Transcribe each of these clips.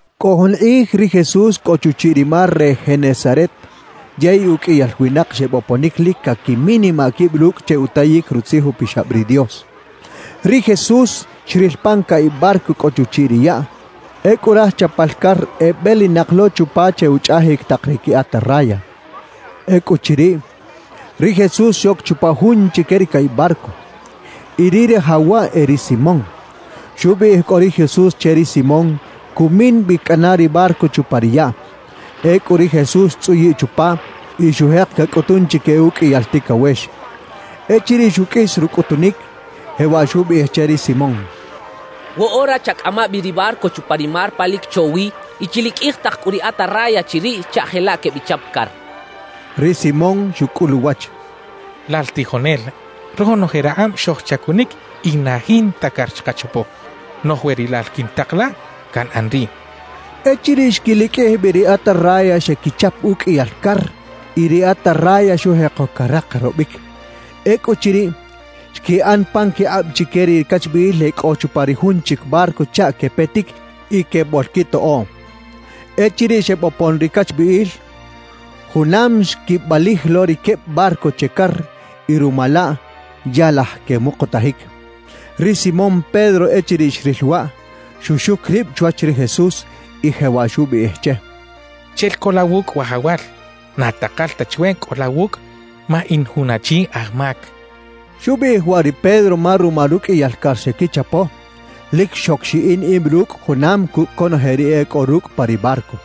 Cꞌo jun kꞌij ri Jesús cꞌo chuchiꞌ ri mar re Genesaret, yey uqꞌuiyal winak xeboponic lic caquiminimaꞌ quib rucꞌ che utayic Rutzij Upixab ri Dios. Ri Jesús xril pan caꞌib barco cꞌo chuchiꞌ ri yaꞌ; ecꞌu raj chapal car ebelinak lo chupa che uchꞌajic tak ri qui atarraya. Ecꞌuchiriꞌ, ri Jesús xoc chupa jun chique ri caꞌib barco. Y ri rajaw waꞌ e ri Simón. Xubiꞌij cꞌu ri Jesús che ri Simón cumin bi cꞌana ri barco chupa ri yaꞌ. Ecꞌu ri Jesús xtzꞌuyiꞌ chupa y xujek cacꞌutun chique ruqꞌuiyal ticawex. Echiriꞌ xuqꞌuis rucꞌutunic, jewaꞌ xubiꞌij che ri Simón: —Woꞌora chacꞌama bi ri barco chupa ri mar pa lic cho wi y chiliqꞌuij tak cꞌu ri atarraya chiriꞌ chaꞌ jelaꞌ quebichap car —xcha che. Ri Simón xucꞌul uwach: —Lal tijonel, ronoje rakꞌab xojchacunic y na jinta car xkachapo. Noꞌj we rilal quintak la, canꞌan riꞌ —xcha che. Echiriꞌ xquiliqꞌuij bi ri atarraya, xequichap uqꞌuiyal car y ri atarraya xujeko carakarobic. Ecꞌuchiriꞌ, xquiꞌan pan quikꞌab chique ri cachbiꞌil e cꞌo chupa ri jun chic barco chaꞌ quepetic y queboꞌlquitoꞌoꞌ. Echiriꞌ xebopon ri cachbiꞌil, junam xquibalij lo ri queb barco che car y ruma laꞌ ya laj quemukutajic. Ri Simón Pedro echiriꞌ xril waꞌ, xuxuc rib chwach ri Jesús y jewaꞌ xubiꞌij che: —Chel co la wucꞌ, Wajawal. Na takal ta chwe cꞌo la wucꞌ ma in jun achi aj mac —xcha che. Xubiꞌij waꞌ ri Pedro ma ruma ruqꞌuiyal car xequichapo, lic xoc xiꞌin ib rucꞌ junam cucꞌ conoje ri e cꞌo rucꞌ pa ri barco;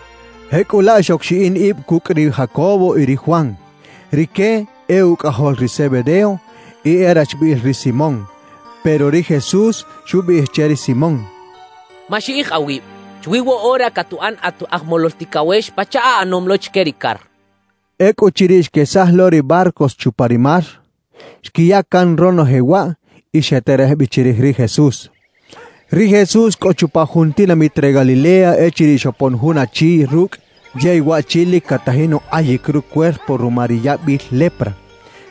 jecꞌulaꞌ xoc xiꞌin ib cucꞌ ri Jacobo y ri Juan; rique e ucꞌajol ri Zebedeo y e rachbiꞌil ri Simón. Pero ri Jesús xubiꞌij che ri Simón: —Maxiꞌij awib; chwi woꞌora catuꞌan at aj molol ticawex pachaꞌ aꞌanom lo chique ri car —xchaꞌ. Ecꞌuchiriꞌ xquesaj lo ri barcos chupa ri mar, xquiya can ronoje waꞌ y xeterej bi chirij ri Jesús. Ri Jesús cꞌo chupa jun tinamit re Galilea echiriꞌ xopon jun achi rucꞌ, yey waꞌchi lic catajin ukꞌayic rucuerpo ruma ri yabil lepra.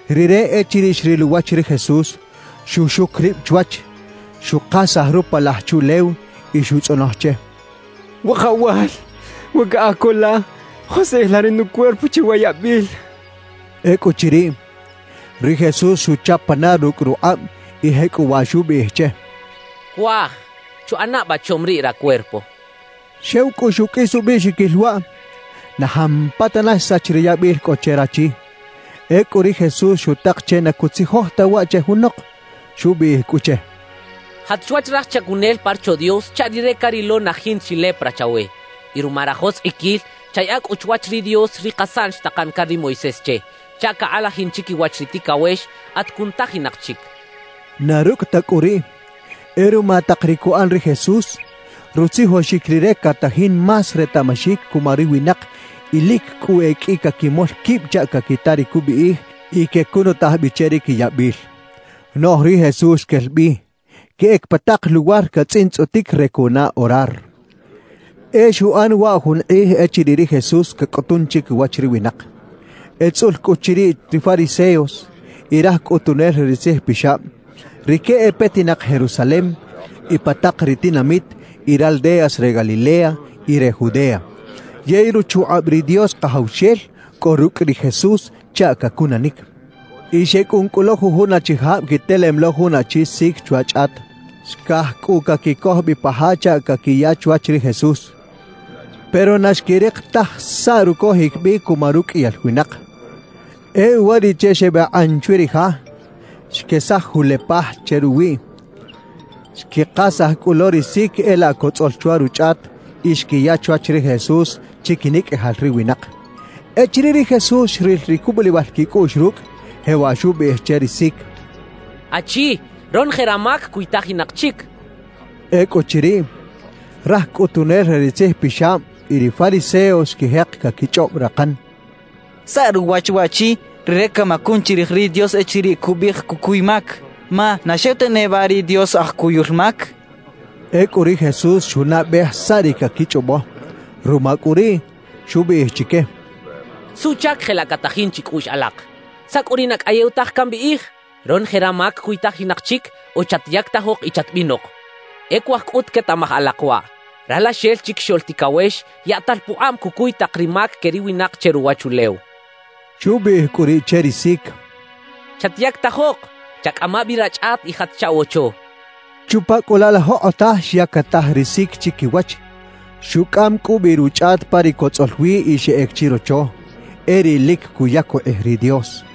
Rire echiriꞌ xril uwach ri Jesús, xuxuc rib chwach, xukasaj rupalaj chuꞌlew y xutzꞌonoj che: —Wajawal, we caꞌaj co la, joskꞌij la ri nucuerpo che wa yabil —xchaꞌ. Ecꞌuchiriꞌ, ri Jesús xuchap pana rucꞌ rukꞌab y jecꞌuwaꞌ xubiꞌij che: —Cuaj, chuꞌana ba chom riꞌ racuerpo —xchaꞌ. Xew cꞌu xuqꞌuis ubiꞌxiquil waꞌ, na jampatana xsach ri yabil cꞌo che rachi. Ecꞌu ri Jesús xutak che na cutzijoj ta waꞌ che junok. Xubiꞌij cꞌu che: —Jat chwach raj chacunel pa Rocho Dios chaꞌ rire carilo na jinta chi lepra chawe. Y ruma rajoskꞌiquil, chayaꞌa cꞌu chwach ri Dios ri kasaꞌn xtakan can ri Moisés che, chaꞌ cakꞌalajin chiquiwach ri ticawex at cunutajinak chic —xchaꞌ. Na rucꞌ ta cꞌu riꞌ, e ruma tak ri cuꞌan ri Jesús, rutzijoxic Rire catajin más retaꞌmaxic cuma ri winak y lic cꞌu e qꞌui caquimol quib chaꞌ caquita ri cubiꞌij y quecunutaj bi che ri quiyabil. Noꞌj ri Jesús quel bi, queꞌec pa tak luwar catzꞌintzꞌotic re cuꞌana orar. E xuꞌan waꞌ jun kꞌij echiriꞌ ri Jesús cacꞌutun chiquiwach ri winak. Etzꞌul cꞌu chiriꞌ ri fariseos y raj cꞌutunel re ri tzijpixab; rique e petinak Jerusalem y pa tak ri tinamit y raldeas re Galilea y re Judea. Yey ruchukꞌab ri Dios Kajawxel cꞌo rucꞌ ri Jesús chaꞌ cacunanic. Y xecꞌun cꞌu lo jujun achijab quitelem lo jun achi sic chwa chꞌat. Xcaj cꞌu caquicoj bi pa ja chaꞌ caquiya chwach ri Jesús, pero na xquirik taj saꞌ rucojic bi cuma ruqꞌuiyal winak. E uwariꞌche xebakꞌan chwi ri ja, xquesaj julepaj che ruwiꞌ, xquikasaj cꞌu lo ri sic e laꞌ cotzꞌol chwa ruchꞌat y xquiya chwach ri Jesús chiquinicꞌajal ri winak. Echiriꞌ ri Jesús xril ri cubulibal quicꞌuꞌx rucꞌ, jewaꞌ xubiꞌij che ri sic: —Achi, ronoje ramac cuytajinak chic —xchaꞌ. Ecꞌuchiriꞌ, raj cꞌutunel re ri tzijpixab y ri fariseos xquijek caquichꞌob rakan: «¿Saꞌ ruwach waꞌchi? Rire camacun chirij ri Dios echiriꞌ cubiꞌij cucuy mac. Ma ¿na xew ta neba ri Dios aj cuyul mac?» Ecꞌu ri Jesús xunaꞌbej saꞌ ri caquichꞌobo; ruma cꞌu riꞌ, xubiꞌij chique: —¿Suꞌchac jelaꞌ catajin chicꞌuꞌx alak? ¿Saꞌ cꞌu ri na cꞌayew taj cambiꞌij: “Ronoje ramac cuytajinak chic” o “Chatyactajok y chatbinok”? E cuaj cꞌut quetaꞌmaj alak waꞌ: Ralaxel Chiquixoꞌl Ticawex yaꞌtal pukꞌab cucuy tak ri mac que ri winak che ruwachulew —xchaꞌ. Xubiꞌij cꞌu riꞌ che ri sic: —Chatyactajok, chacꞌama bi rachꞌat y jat chaꞌwocho —xchaꞌ. Chupa cꞌu laꞌ la jokꞌotaj xyactaj ri sic chiquiwach. Xucꞌam cꞌu bi ruchꞌat pa ri cotzꞌol wi y xeꞌec chirocho, e riꞌ lic cuyac ukꞌij ri Dios.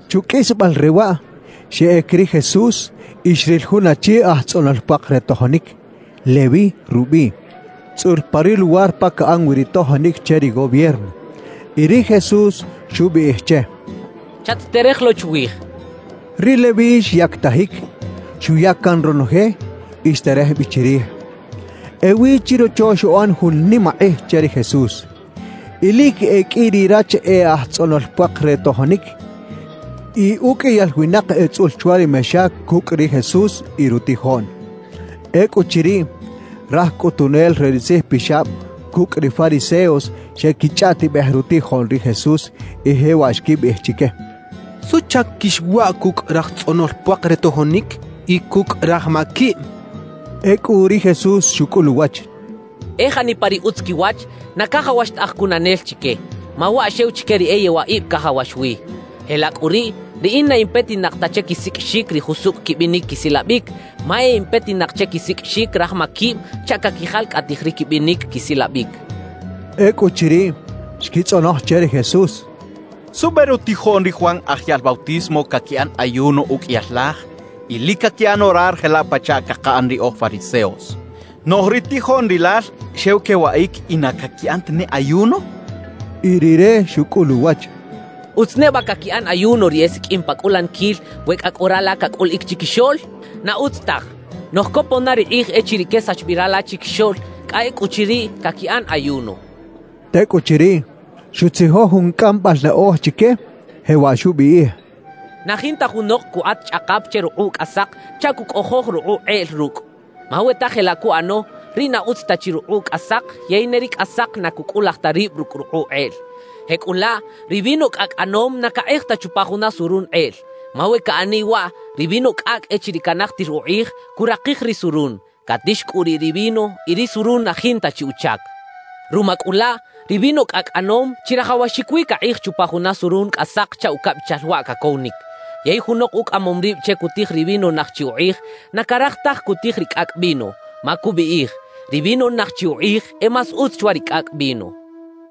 Chuqꞌuisbal re waꞌ, xeꞌec ri Jesús y xril jun achi aj tzꞌonol puak re tojonic, Leví rubiꞌ, tzꞌul pa ri luwar pa caꞌan wi ri tojonic che ri gobierno. Y ri Jesús xubiꞌij che: —Chat-terej lo chwij —xchaꞌ. Ri Leví xyactajic, xuya can ronoje y xterej bi chirij. Ewi chirocho xuꞌan jun nimakꞌij che ri Jesús. Y lic e qꞌui ri rach e aj tzꞌonol puak re tojonic y uqꞌuiyal winak etzꞌul chwa ri mexa cucꞌ ri Jesús y rutijoꞌn. Ecꞌuchiriꞌ, raj cꞌutunel re ri tzijpixab cucꞌ ri fariseos xequichꞌaꞌtibej rutijoꞌn ri Jesús, y jewaꞌ xquibiꞌij chique: —¿Suꞌchac quixwaꞌ cucꞌ raj tzꞌonol puak re tojonic y cucꞌ raj maquib? —xechaꞌ. Ecꞌu ri Jesús xucꞌul uwach: —E janipa ri utz quiwach, na cajawax ta aj cunanel chique; ma waꞌ xew chique ri e yewaꞌib cajawax wi. Jelaꞌ cꞌu riꞌ, riꞌin na in petinak ta che quisiqꞌuixic ri jusucꞌ quibinic quisilabic, ma e in petinak che quisiqꞌuixic raj maquib chaꞌ caquijalcꞌatij ri quibinic quisilabic —xchaꞌ. Ecꞌuchiriꞌ, xquitzꞌonoj che ri Jesús: —¿Suꞌbe rutijoꞌn ri Juan Aj Yaꞌl Bautismo caquiꞌan ayuno uqꞌuiyal laj y lic caquiꞌan orar jelaꞌ pachaꞌ cakaꞌan ri oj fariseos, noꞌj ri tijoꞌn rilal xew quewaꞌic y na caquiꞌan tane ayuno? —xechaꞌ. Y Rire xucꞌul uwach: —¿Utz neba caquiꞌan ayuno ri esiqꞌuim pa cꞌulaniquil we cꞌa cꞌo rala cacꞌuliꞌic chiquixoꞌl? Na utz taj. Noꞌj copon na ri kꞌij echiriꞌ quesax bi rala chiquixoꞌl; cꞌa ecꞌuchiriꞌ, caquiꞌan ayuno —xchaꞌ. Tecꞌuchiriꞌ, xutzijoj jun cꞌambal naꞌoj chique, jewaꞌ xubiꞌij: «Na jinta junok cukꞌat chꞌakap che rukꞌuꞌ cꞌasak chaꞌ cucꞌojoj rukꞌuꞌ kꞌeꞌl rucꞌ. Ma we ta jelaꞌ cuꞌano, riꞌ na utz ta chi rukꞌuꞌ cꞌasak yey ne ri cꞌasak na cucꞌulaj ta rib rucꞌ rukꞌuꞌ kꞌeꞌl. »Jecꞌulaꞌ ri vino cꞌacꞌ ꞌanom na cakꞌej ta chupa juna surun kꞌeꞌl. Ma we caꞌaniꞌ waꞌ, ri vino cꞌacꞌ echiriꞌ canajtir ukꞌij, curakij ri surun, catix cꞌu riꞌ ri vino y ri surun na jinta chi uchac. Ruma cꞌu laꞌ, ri vino cꞌacꞌ ꞌanom chirajawaxic wi cakꞌej chupa juna surun cꞌasak chaꞌ ucabichal waꞌ cacowinic. Yey junok ucꞌamom rib che cutij ri vino naj chi ukꞌij, na caraj taj cutij ri cꞌacꞌ vino, ma cubiꞌij: “Ri vino naj chi ukꞌij e más utz chwa ri cꞌacꞌ vino”» xchaꞌ.